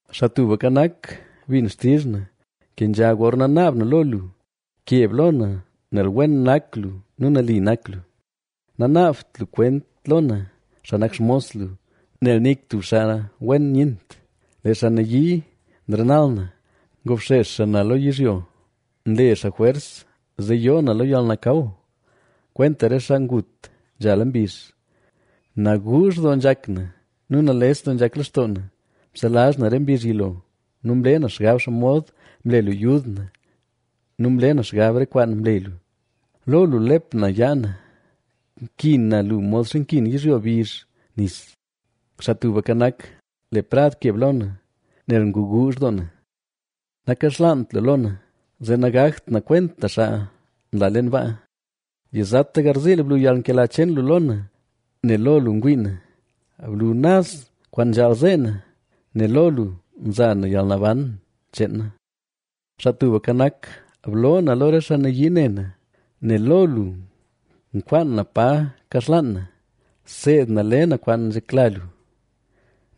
Xaa Tubka Nak, bin xtizh na; kenzha gorna naab na lo lu. Keb lo na, nel wen nak lu nu nali nak lu. Nanaabt lu kwent lo na, xaa nak xmos lu, nel nik tub xaa wen nyent. Lee xaa nayii nrenal na; ngobxex xaa na lo yizhyo. Nle xaa jwers zee yoo na lo yalnakaw, kwenta re xaa ngut nzhala mbizh. Naguuzh doo nzhak na nu nales doo nzhak lextoo na. Mselazh na re mbizh yilo nu mle na xgab xomod mle lu yud na nu mle na xgab re kwaan mle lu. Lo lu nlep na yaa na; nkin na lu modxa nkin yizhyo bizh nis. Xaa Tubka Nak, le prad keb lo na, nel nguguuzh doo na; nakaxlaant lu lo na, zee nagakt na kwenta xaa nla leen baa. Yizata garziil blu yalnkela cheen lu lo na, nel lo lu ngwii na. Blu naz kwaan nzhaal zee na, nel lo lu nza na yalnaban cheen na. Xaa Tubka Nak, bloo na lo re xaa nayii ne na, nel lo lu nkwaan na pa kaxlaan na. Seed na le na kwaan nzhekla lu,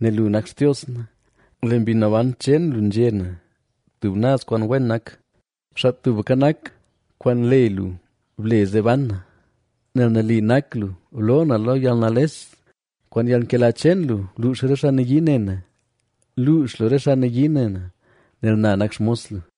nel lu nak Xtios na. Le Mbi Naban cheen lu nzhe na tub naz kwaan wen nak. Xaa Tubka Nak, kwaan le lu ble zee ban na, nel nali nak lu, bloo na lo yalnales. Kwaan yalnkela cheen lu, bluux re xaa nayii ne na, luux lu re xaa nayii ne na, nel na nak xmos lu.